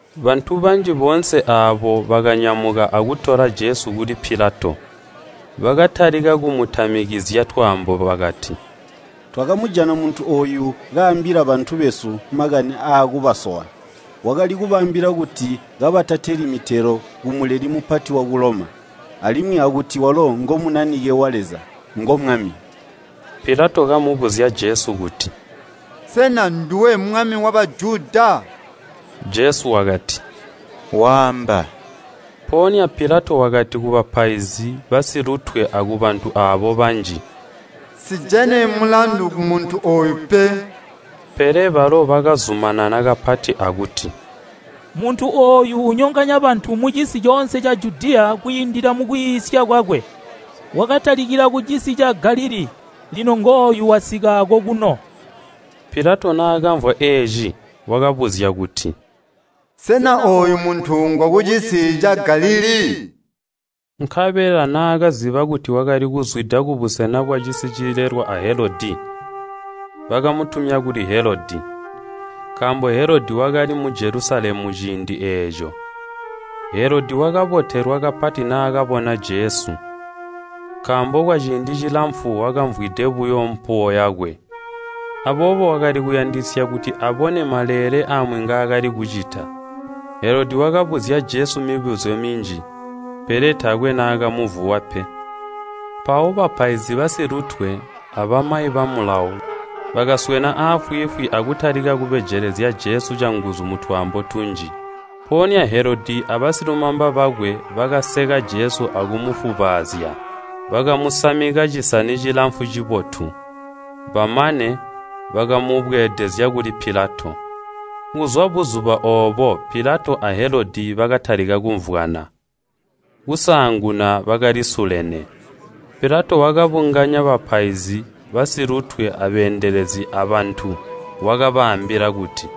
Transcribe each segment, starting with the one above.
Bantu banji boonse aabo bakanyamuka akutola Jesu kuli Pilato. Bakatalika kumutamikizya twaambo bakati, “Twakamujata muntu ooyu kaambila bantu besu makani aakubasowa, wakali kubaambila kuti kabatateli mitelo ku Muleli Mupati waku Loma, alimwi akuti walo ngo Munanike wa Leza, ngo Mwami.” Pilato kamubuzya Jesu kuti, “Sena nduwe mwami wa Bajuda?” Jesu wakati, “Waamba.” Mpoonya Pilato wakati kubapaizi basilutwe akubantu aabo banji, “Nsijene mulandu kumuntu ooyu pe.” Pele balo bakazumanana kapati akuti, “Muntu ooyu unyonganya bantu mucisi coonse ca Judiya kwiindila mukwiisya kwakwe. Wakatalikila kucisi ca Galilii, lino ngooyu wasika akokuno.” Pilato naakamvwa eeci, wakabuzya kuti, “Sena ooyu muntu ngwakucisi ca Galilii?” Nkabela naakaziba kuti wakali kuzwida kubusena bwacisi cilelwa a Helodi wakamutumya kuli Helodi, nkaambo Helodi wakali mu Jelusalemu ciindi eeco. Helodi wakabotelwa kapati naakabona Jesu, nkaambo kwaciindi cilamfu wakamvwide buyo mpuwo yakwe, aboobo wakali kuyandisya kuti abone maleele amwi ngaakali kucita. Helodi wakabuzya Jesu mibuzyo minji, pele taakwe naakamuvuwa pe. Mpawo bapaizi basilutwe abamayi ba Mulawo bakaswena aafwiifwi akutalika kubejelezya Jesu canguzu mutwaambo tunji. Mpoonya Helodi abasilumamba bakwe bakaseka Jesu akumufubaazya. Bakamusamika cisani cilamfu cibotu, bamane, bakamubweedezya kuli Pilato. Kuzwa buzuba oobo Pilato a Helodi bakatalika kumvwana, kusaanguna bakalisulene. Pilato wakabunganya bapaizi basilutwe, abeendelezi, abantu, wakabaambila kuti,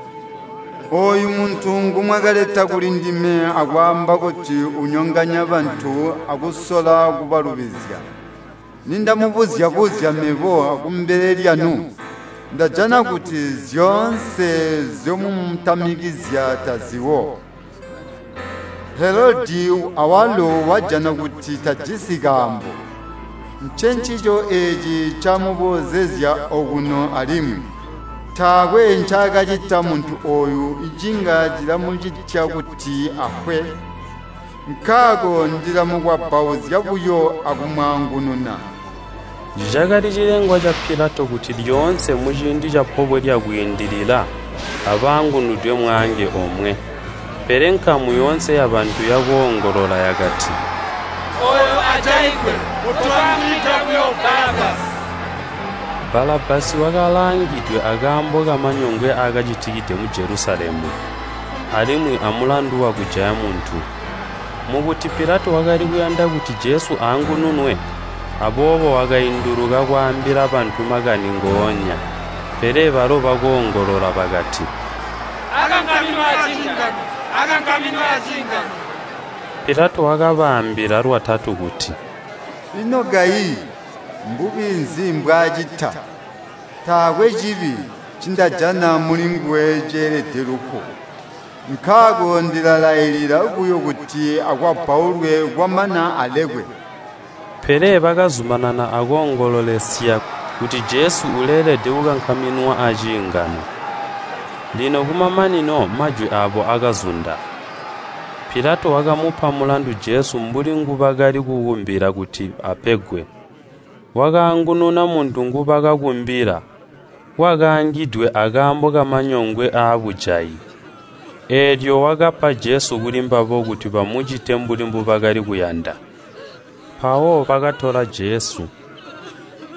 “Ooyu muntu ngomwakaleta kulindime akwaamba kuti unyonganya bantu akusola kubalubizya, nindamubuzya-buzya mebo kumbele lyanu, ndajana kuti zyoonse nzyomumutamizya taziwo. Helodi awalo wajana kuti tajisi kaambo, ncencico eeci ncaamuboozezya okuno alimwi. Taakwe ncaakacita muntu ooyu cinga cilamucitya kuti afwe. Nkaako, ndilamukwabbauzya buyo akumwaangununa.” [ Cakali cilengwa ca Pilato kuti lyoonse muciindi ca Pobwe lya Kwiindilila abaangunwide mwaange omwe.] Pele nkamu yoonse yabantu yakoongolola yakati, “Ooyu ajaigwe! Kotwaangunwida buyo Balabbasi!” Balabbasi wakalaangidwe akaambo kamanyongwe aakacitikide mu Jelusalemu, alimwi amulandu wakujaya muntu. Mukuti Pilato wakali kuyanda kuti Jesu aangununwe, aboobo wakainduluka kwaambila bantu makani ngoonya. Pele balo bakoongolola bakati, “Akankaminwe aciingano! Akankaminwe aciingano!” Pilato wakabaambila lwatatu kuti, “Ino kayi, mbubi nzi mbwaacita? Taakwe cibi ncindajana mulinguwe ceelede lufu. Nkaako ndilalailila buyo kuti akwabbaulwe kwamana alekwe.” Pele bakazumanana akoongololesya kuti Jesu uleelede kukankaminwa aciingano, lino kumamanino majwi aabo akazunda. Pilato wakamupa mulandu Jesu mbuli ngubakali kukumbila kuti apegwe. Wakaangununa muntu ngubakakumbila, wakaangidwe akaambo kamanyongwe abujayi, eelyo wakapa Jesu kulimbabo kuti bamucite mbuli mbubakali kuyanda. Mpawo bakatola Jesu,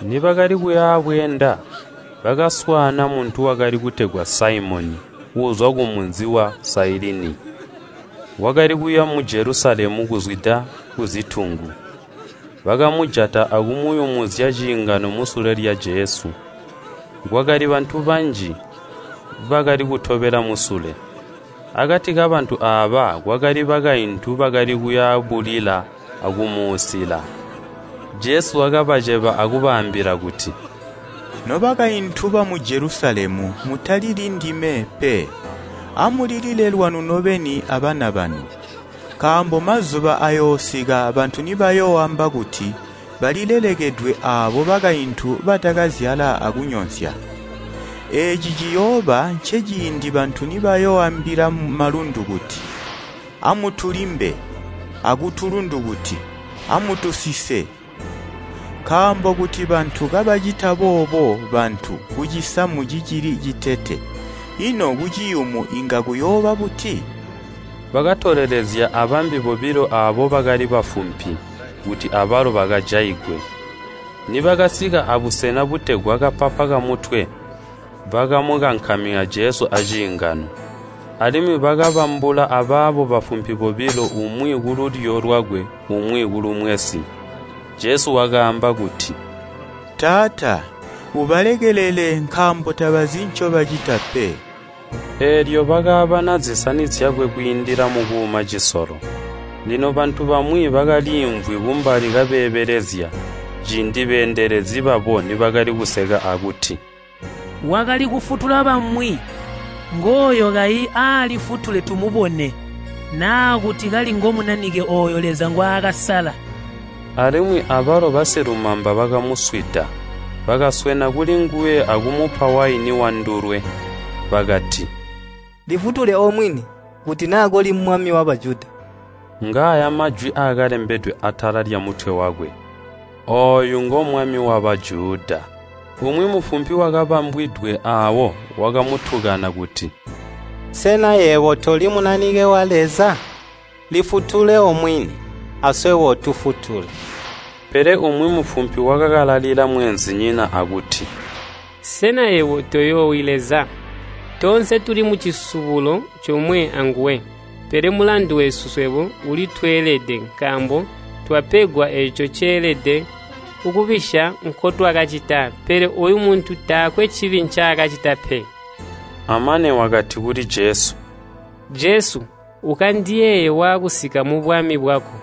nibakali kuyabweenda, bakaswaana muntu wakali kutegwa Saimoni, uuzwa kumunzi wa Sailini, wakali kuya mu Jelusalemu kuzwida kuzitungu. Bakamujata akumuyumuzya ciingano musule lya Jesu. Kwakali bantu banji, bakali kutobela musule. Akati kabantu aaba kwakali bakaintu bakali kuya bulila akumuusila. Jesu wakabaceba akubaambila kuti, “Nobakaintu bamu Jelusalemu mutalili ndime pe, amulilile lwanu nobeni abana banu. Nkaambo mazuba ayoosika bantu nibayooamba kuti, ‘Balilelekedwe aabo bakaintu batakazyala akunyonsya!’ Eeci ciyooba nceciindi bantu nibayooambila malundu kuti, ‘Amutulimbe!’ akutulundu kuti, ‘Amutusise!’ Nkaambo kuti bantu kabacita boobo bantu kucisamu cicili citete, ino kuciyumu inga kuyooba buti?” Bakatolelezya abambi bobilo aabo bakali bafumpi, kuti abalo bakajaigwe. Nibakasika abusena butegwa “Kapapa Kamutwe” bakamukankamina Jesu aciingano, alimwi bakabambula abaabo bafumpi bobilo umwi kululyo lwakwe umwi kulumwensi. Jesu wakaamba kuti, “Taata, ubalekelele, nkaambo tabazi ncobacita pe.” Eelyo bakaabana zisani zyakwe kwiindila mukuuma cisolo. Lino bantu bamwi bakaliimvwi kumbali kabeebelezya, ciindi beendelezi babo nibakali kuseka akuti, “Wakali kufutula bamwi, ngooyo kayi aalifutule tumubone, naa kuti kali ngo Munanike ooyo Leza ngwaakasala!” Alimwi abalo basilumamba bakamuswida. Bakaswena kulinguwe akumupa waini wandulwe. Bakati, “Lifutule omwini, kuti naa koli mwami wa Bajuda!” Ngaaya majwi akalembedwe atala lyamutwe wakwe, “Ooyu ngo Mwami wa Bajuda.” Umwi mufumpi wakabambwidwe aawo wakamutukana kuti, “Sena yebo toli Munanike wa Leza? Lifutule omwini, aswebo utufutule!” Pele umwi mufumpi wakakalalila mweenzinyina akuti “Sena yebo toyoowi Leza? Toonse tuli mucisubulo comwe anguwe. Pele mulandu wesu swebo ulitweelede, nkaambo twapegwa eeco ceelede kubisya nkutwakacita, pele ooyu muntu taakwe cibi ncaakacita pe.” Amane wakati kuli Jesu, “Jesu, ukandiyeeye waakusika mubwami bwako!”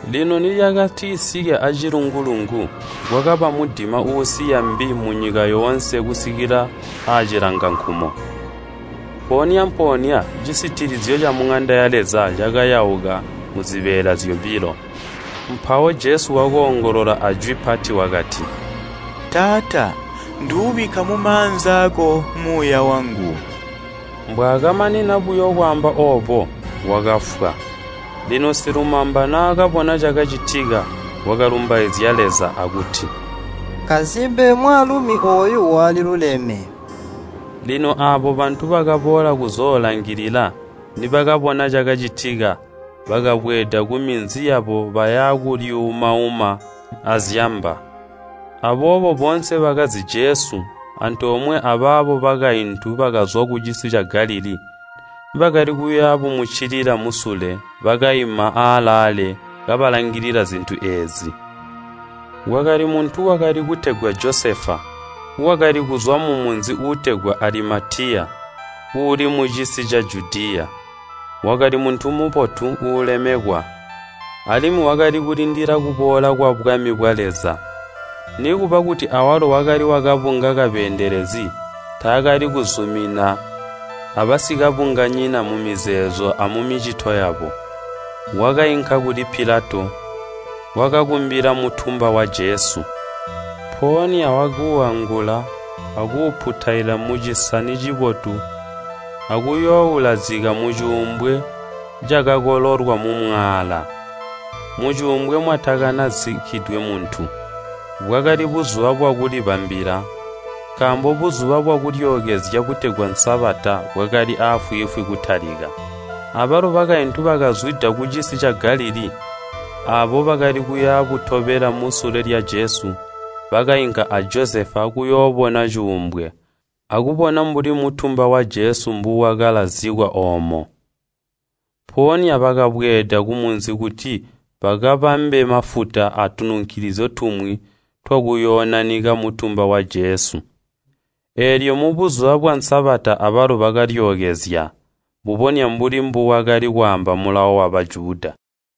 Lino nilyakatisike aacilungu-lungu, kwakaba mudima uusiya mbi munyika yoonse kusikila aacilangankumo. Mpoonya-mpoonya cisitilizyo ca muŋanda ya Leza cakayauka muzibeela zyobilo. Mpawo Jesu wakoongolola ajwi pati wakati, “Taata! Nduubikka mumaanza aako muuya wangu!” Mbwaakamanina buyo kwaamba oobo, wakafwa. Lino silumamba naakabona cakacitika, wakalumbaizya Leza akuti, “Nkasimpe mwaalumi ooyu waliluleme!” Lino aabo bantu bakaboola kuzoolangilila, nibakabona cakacitika, bakabweeda kuminzi yabo baya bulyuumauma azyamba. Aboobo boonse bakazi Jesu, antoomwe abaabo bakaintu bakazwa kucisi ca Galilii, bakali kuya bumuccilila musule, bakaima aalaale kabalangilila zintu eezi. Kwakali muntu wakali kutegwa Josefa, wakali kuzwa mumunzi uutegwa Alimatiya uuli mucisi ca Judiya. Wakali muntu mubotu, uulemekwa, alimwi wakali kulindila kuboola kwabwami bwa Leza. Nikuba kuti awalo wakali wakabunga kabeendelezi, taakali kuzumina abasikabunganyina mumizeezo amumicito yabo. Wakainka kuli Pilato, wakakumbila mutumba wa Jesu. Mpoonya wakuuangula, akuuputaila mucisani cibotu akuyooulazika mucuumbwe cakakololwa mumwaala, mucuumbwe mwatakana zikkidwe muntu. Bwakali buzuba bwakulibambila, nkaambo Buzuba bwa Kulyookezya butegwa Sabata bwakali aafwiifwi kutalika. Abalo bakaintu bakazwida kucisi ca Galilii, aabo bakali kuya butobela musule lya Jesu, bakainka a Josefa kuyoobona cuumbwe, akubona mbuli mutumba wa Jesu mbuwakalazikwa oomo. Mpoonya bakabweeda kumunzi kuti bakabambe mafuta atununkilizyo tumwi twakuyoonanika mutumba wa Jesu. Eelyo mubuzuba bwa Sabata abalo bakalyookezya, mbubonya mbuli mbuwakali kwaamba Mulawo wa Bajuda.